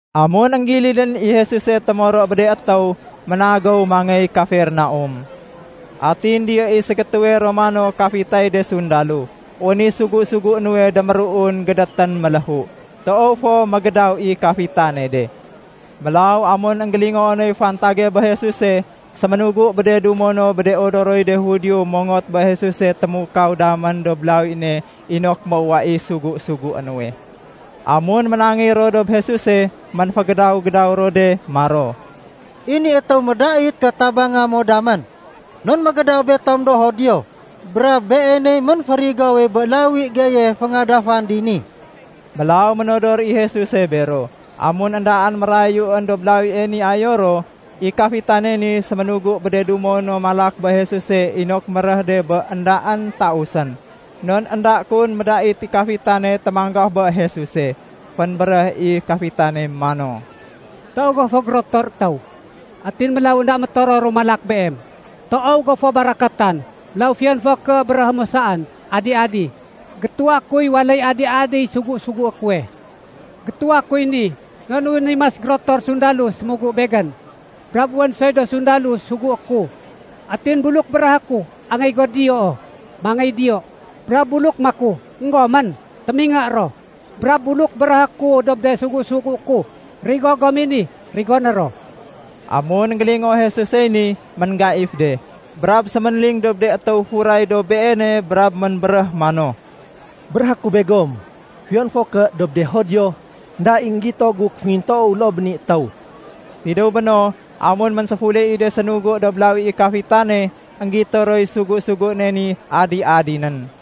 Amun énggilidén i Jesuse témoro bé de étéw, ménagéw mangéy Kafernaum. Atin diyo i ségétéwe Romano kafitay de sundalo. Wén i sugu-sugué nuwe déméruun gédétén méléhu. Toow fo mégédaw i kafitane de. Mélaw amun énggélingoo noy fantage bé Jesuse, séménugu bé de dumo bé de odoroy de Judio mongot bé Jesuse témukaw damén dob lawi ne inok méuwa i sugu-sugué nuwe. Amun ménangéy ro dob Jesuse, ménfégédaw-gédaw ro de maro, “I ni étéw médait ké tabanga mo damén. Non mégédaw betom do Judio, brab beeney ménférigowe bé lawi geye féngadafan dini.” Mélaw ménodor i Jesuse bero. Amun éndaén mérayuén dob lawie ni ayo ro, i kafitane ni séménugu bé de dumo no malak bé Jesuse inok méréh de bé éndaén tausén, non énda médait kun i kafitane témanggaf bé Jesuse. Fénbéréh i kafitane mano, “Toow go fo gérotor étéw, atin mélaw énda métororu malak Beem. Toow go fo barakatan, mélaw fiyon fo ké béréhé mo saén, ‘Adi-adi’, gétuwa kuy waléy adi-adiy sugu-sugué kuwe. Gétuwa kuy ni non wén i mas gérotor sundalo sémugu begén. Brab wén soy do sundalo sugué ku. Atin buluk béréhé ku, ‘Angéy go diyoo’, mangéy diyo. Brab buluk maku, ‘Enggomén’, témingé ro. Brab buluk béréhé ku dob de sugu-sugué ku, ‘Rigo gom i ni’, rigoné ro.” Amun énggélingoo Jesusey ni, ménggaif de. Brab séménling dob de étéw furay dob Beene brab ménbéréh mano, “Béréhé ku begom, fiyon fo ké dob de Judio, énda i énggito gu kéféngintoow loo bé ni étéw.” Tidéw béno, amun ménséfule i de sénugu dob lawi i kafitane, énggito roy sugu-suguéne ni adi-adi nén.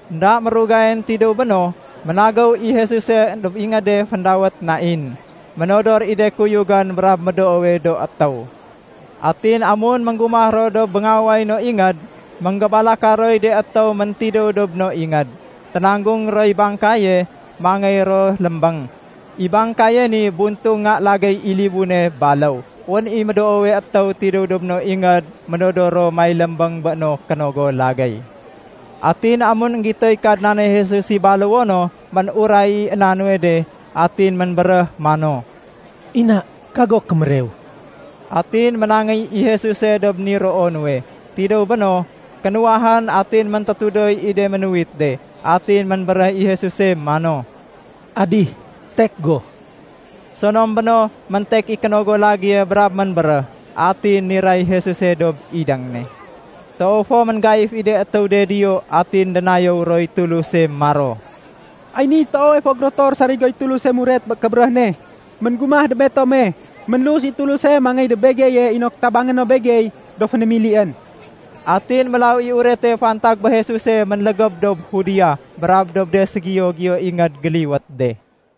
Enda mérugayén tidéw béno, ménagéw i Jesuse dob ingéde féndawét Nain. Ménodor i de kuyugén brab médoowe do étéw. Atin amun ménggumah ro dob béngaway no ingéd, ménggébalaka roy de étéw méntidéw dob no ingéd. Ténanggung roy bangkaye, mangéy ro lémbéng. I bangkaye ni buntung nga lagéy i libune baléw. Wén i médoowe étéw tidéw dob no ingéd ménodor ro may lémbéng bé no kénogo lagéy. Atin amun énggitoy Kadnane Jesus i baléwo no, ménuray i éna nuwe de. Atin ménbéréh mano, “Ina, kago kémérew.” Atin ménangéy i Jesuse dob niroo nuwe. Tidéw béno, kénuwahén atin méntétudoy i de ménuwit de. Atin ménbéréh i Jesuse mano, “Adih, tek go!” Sonom béno, méntek i kénogo lagéye brab ménbéréh. Atin niray Jesuse dob idéng ne. Toow fo ménggaif i de étéw de diyo atin dénayéw roy Tuluse maro, “Ay niy toowe fo gérotor sarigoy Tuluse muret bé kébéréh ne, ménggumah dob betome. Ménlus i Tuluse mangéy dob begeye inok tabanga no begey do fénémilién.” Atin mélaw i urete fantag bé Jesuse ménlégéb dob Judea, brab dob de ségiyo-giyo ingéd géliwét de.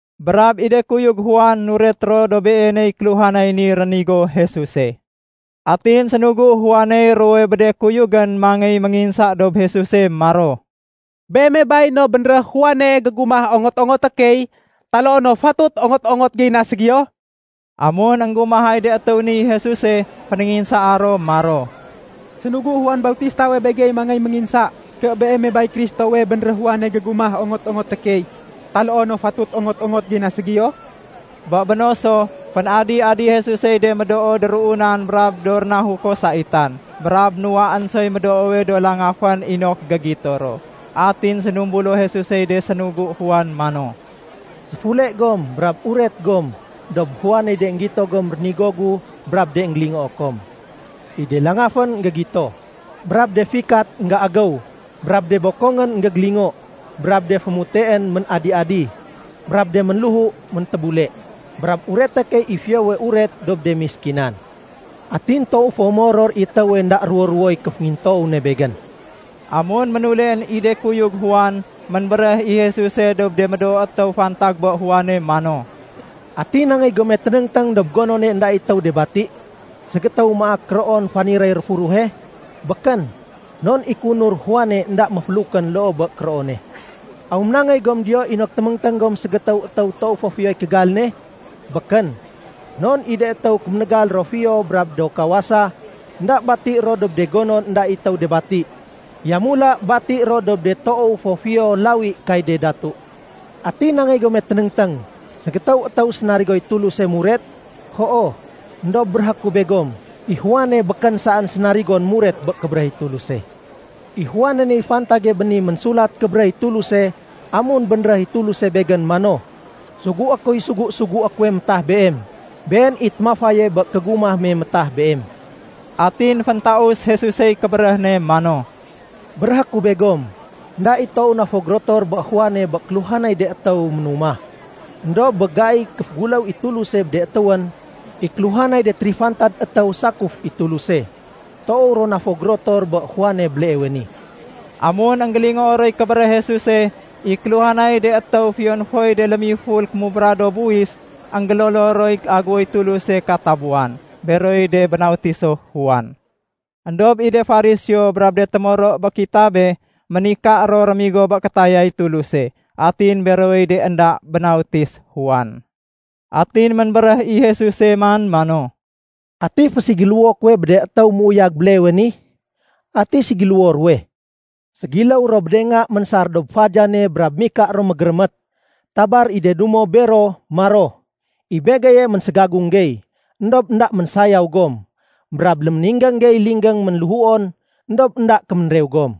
Brab i de kuyug Juan nuret ro dob beeney kéluhanay ni rénigo Jesuse. Atin sénugu Juaney ruwowe bé de kuyugén mangéy ménginsa dob Jesuse maro, “Beeme bay no bénréh Juane gégumah ongot-ongoté key, taloo no fatut ongot-ongot gey na ségiyo?” Amun énggumahay de étéw niy Jesuse, fénénginsaa ro maro, “Sénugu Juan Bautistawe begey mangéy ménginsa ké Beeme bay Kristowe bénréh Juane gégumah ongot-ongoté key, taloo no fatut ongot-ongot gey na ségiyo?” Bé béno so, fén-adi-adi Jesusey de médoo déruunan brab do rénahuko saitan, brab nuwaén soy médoowe do langafén inok gégito ro. Atin sénumbulo Jesusey de sénugu Juan mano, “Séfule gom brab uret gom dob Juaney de énggito gom rénigo gu brab de énggélingoo kom. I de langafén énggégito, brab de fikat énggéagéw, brab de bokongén énggégélingo, brab de fémuteén ménadi-adi, brab de ménléhu méntébule. Brab ureté key i Fiyowe Uret dob de méskinan. Atin toow fo méoror i étéwe énda ruwo-ruwoy kéféngintoow ne Begén.” Amun ménuleén i de kuyug Juan, ménbéréh i Jesuse dob de médoo étéw fantag bé Juane mano, “Ati nangéy gome ténéngténg dob gonone énda i étéw de bati? Ségétéw maak kéroon faniréy réfuruhe? Békén, non i kéunur Juane énda méfélukén loo bé kéroone. Aw ménangéy gom diyo inok téméngténg gom ségétéw étéw toow fo fiyoy kégal ne? Békén, non i de étéw kémégal ro fiyo brab do kawasa, énda bati ro dob de gonon énda i étéw de bati. Yamula bati ro dob de toow fo fiyo lawi kay de datu. Ati nangéy gome ténéngténg? Ségétéw étéw sénarigoy Tuluse muret? Hoo, éndob béréhé ku begom, i Juane békén saén sénarigon muret bé kébéréh i Tuluse. I Juane niy fantage bé ni Ménsulat Kébéréh i Tuluse amun bénréh i Tuluse Begén mano, ‘Sugué kuy sugu-sugué kuwe métah Beem. Been i témafaye bé kégumah me métah Beem.’” Atin féntaus Jesusey kébéréh ne mano, “Béréhé ku begom, énda i toow na fo gérotor bé Juane bé kéluhanay de étéw ménumah. Endob bé gaiy kéféguléw i Tuluse bé de étéwén, i kéluhanay de térifantad étéw sakuf i Tuluse, toow ro na fo gérotor bé Juane béleewe ni.” Amun énggélingoo roy kébéréh Jesuse, i kéluhanay de étéw fiyon foy de lémiful kémubra do buwis, énggélolo roy aguwoy Tuluse katabuwan. Beroy de bénautiso Juan. Endob i de Fariseo brab de témoro bé kitabe, ménika ro rémigo bé kétayay Tuluse. Atin berowey de énda bénautis Juan. Atin ménbéréh i Jesuse man mano, “Ati féségiléwo kuwe bé de étéw méuyag béleewe ni? Ati ségiléwo ruwe? Ségiléw ro bé de nga ménsar dob fadiyane brab mika ro mégérémét. Tabar i de dumo ro bero maro, ‘I begeye ménségagung gey, éndob énda ménsayaw gom. Brab léméninggéng gey linggéng ménléhuon, éndob énda kéménrew gom.’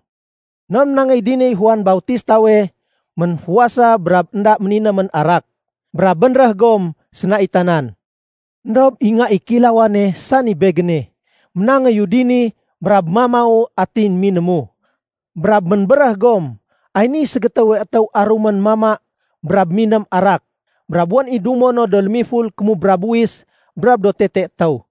Non ménangéy diniy Juan Bautistawe ménfuwasa brab énda méninémén arak. Brab bénréh gom, ‘Sénaitanan.’ Endob i Nga i Kéilawane, sani Begéne, ménangéyu dini, brab mamau atin minému. Brab ménbéréh gom, ‘Ay niy ségétéwe étéw arumén mama brab miném arak, brab wén i dumo no do lémiful kémubra buwis brab do tete étéw.’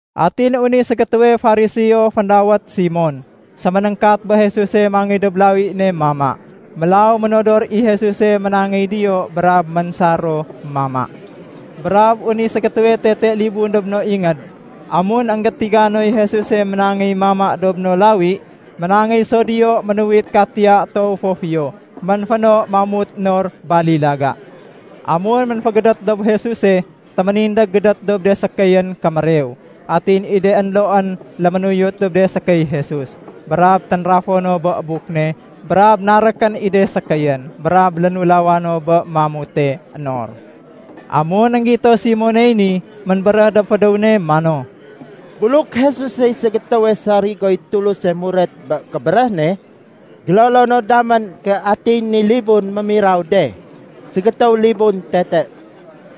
Atin wén i ségétéwe Fariseo, féndawét Simon, séménéngkat bé Jesuse mangéy dob lawi ne mama. Mélaw ménodor i Jesuse ménangéy diyo brab ménsar ro mama. Brab wén i ségétéwe tete libun dob no ingéd. Amun énggétiga noy Jesuse ménangéy mama dob no lawi, ménangéy so diyo ménuwit katiya toow fo fiyo, ménféno mamut nor balilaga. Amun ménfégédét dob Jesuse, téménindég gédét dob de sékéyén kémérew. Atin i de énloén léménuyut dob de sékéy Jesus. Brab ténrafo no bé buk ne brab narékén i de sékéyén. Brab lénulawa no bé mamute nor. Amun énggito Simoney ni, ménbéréh dob fédéw ne mano, “Buluk Jesusey ségétéwe sarigoy Tuluse muret bé kébéréh ne, gélolo no damén ké atiy ni libun mémiraw de, ségétéw libun tete.”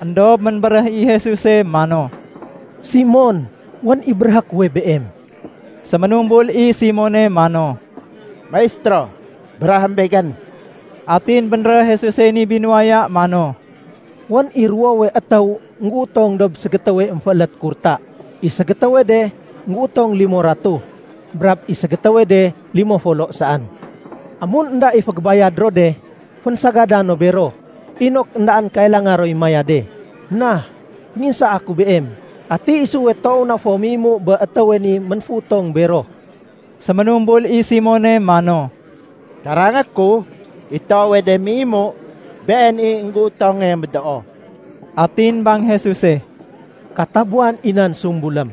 Endob ménbéréh i Jesuse mano, “Simon, wén i béréhé kuwe Beem.” Séménumbul i Simone mano, “Maistéro, béréhém begén.” Atin bénréh Jesusey ni binuwaya mano, “Wén i ruwowe étéw énggéutong dob ségétéwe émféélét kurta. I ségétéwe de énggéutong limo ratuh, brab i ségétéwe de limo folo saén. Amun énda i fégébayad ro de, fénsagada no bero, inok éndaén kailanga roy mayade. Na fénginsaa ku beem, ati isuwe toow na fo méimu bé étéwe ni ménféutong bero?” Séménumbul i Simone mano, “Karangé ku, i toowe de méimu, been i énggéutonge médoo.” Atin bang Jesuse, “Katabuwan i nan sumbulém.”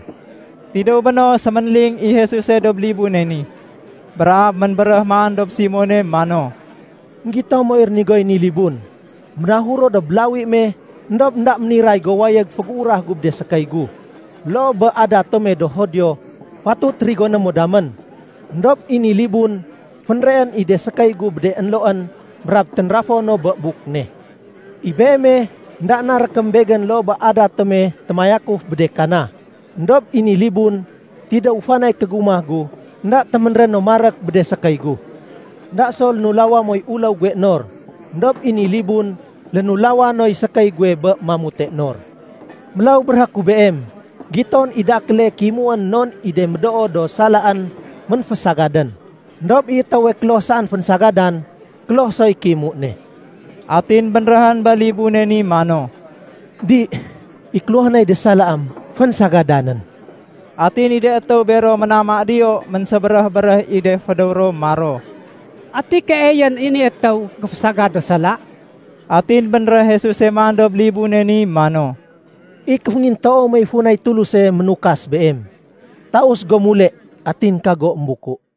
Tidéw béno, séménling i Jesuse dob libune ni, brab ménbéréh man dob Simone mano, “Enggito moy rénigoy ni libun? Ménahuru dob lawi me, éndob énda méniray go wayég fégéurah gu bé de sékéy gu, loo bé adat tome do Judio fatut rigoné mo damén. Endob i ni libun fénreén i de sékéy gu bé de énloén, brab ténrafo no bé buk ne. I beeme, énda narékém Begén loo bé adat tome témayakuf bé de kana. Endob i ni libun, tidéw fanay kégumah gu, énda téménréno marék bé de sékéy gu. Enda so lénulawa moy uléw guwe nor. Endob i ni libun, lénulaw noy sékéy guwe bé mamute nor. Mélaw béréhé ku beem, giton i dakéle kéimuén non i de médoo do salaén ménfésagadén. Endob i étéwe kloh saén fénsagadan, kloh soy kéimu ne.” Atin bénréhén bé libune ni mano, “Di, i kéluhanay de salaém fénsagadanén.” Atin i de étéw bero ménama diyo ménsébéréh-béréh i de fédéw ro maro, “Ati keeyén i ni étéw géfésagad do sala?” Atin bénréh Jesuse man dob libune ni mano, “I kéféngintoow mey funay Tuluse ménukas beem. Taus go mule, atin kago émbuku.”